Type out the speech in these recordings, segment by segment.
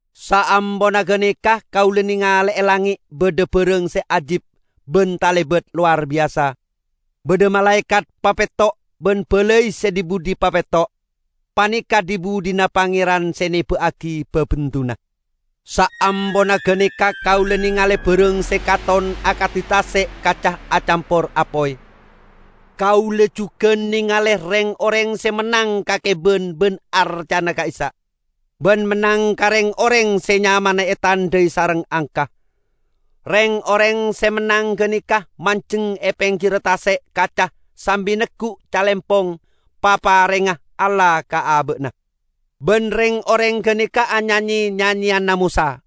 Saamponna ganeka kaula nengale e langnge' badha barang se ajib ban talebat lowar biyasa. Badha malaekat papetto' ban balai se dhi-budhi papetto'. Paneka' dhi-budhina Pangeran se neba'agi babendunna. Saamponna ganeka kaula nengale barang se katon akadi tase' kaca acampor apoy. Kaula jugan nengale reng-oreng se mennang ka keban ban arcana ka'issa', ban mennang ka reng-oreng se nyamana etandhai sareng angka. Reng-oreng se mennang ganeka manjeng e penggirra tase' kaca sambi neggu' calempong paparengnga Allah ka aba'na. Ban reng-oreng ganeka anyanye nyanyeyanna Mosa,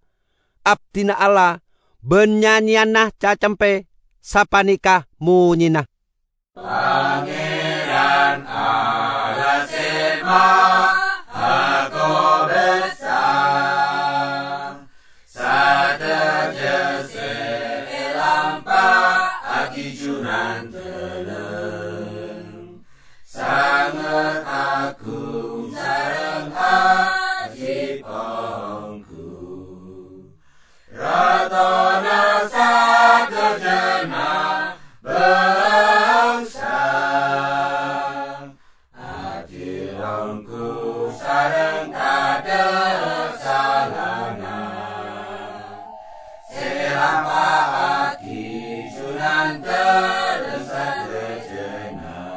abdina Allah, ban nyanyeyanna Cacempe. Sapaneka monyena: "Pangeran, Allah Se Mahakobasa, sadaja se elampa'agi Junandalem sanget agung sareng ajib onggu! Ratona sadajana bangsa, adil onggu sareng tadha' salana se elampa'agi Junandalem sadajana!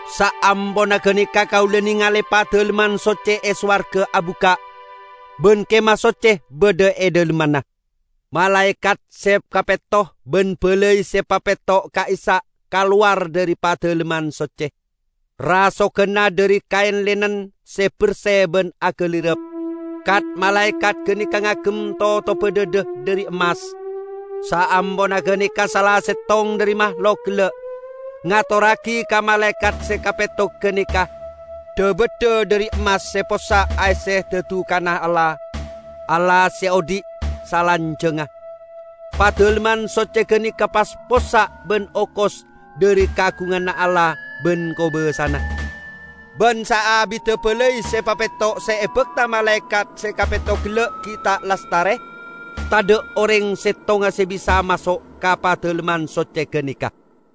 Saamponna ganeka kaula nengale Padalemman Socce e sowarga abukka', ban Kemah Socce badha e dhalemmanna. Malaekat se kapetto ban balai se papetto' ka'issa' kalowar dhari Padalemman Socce. Rasoganna dhari kaen linen se berse ban agalirap. Kat-malaekat ganeka ngagem totobba dhadha dhari emmas. Saamponna ganeka sala settong dhari mahlok gella' ngatorragi ka malaekat se kapetto ganeka dha-baddha dhari emmas se possa' aesse dadukanna Allah -- Allah se odhi' salanjangnga. Padalemman Socce ganeka pas possa' ban okos dhari kaagunganna Allah ban kobasana. Ban saabidda balai se papetto' se ebakta malaekat se kapetto gella' gi' ta' lastare, tadha' oreng settonga se bisa maso' ka Padalemman Socce ganeka.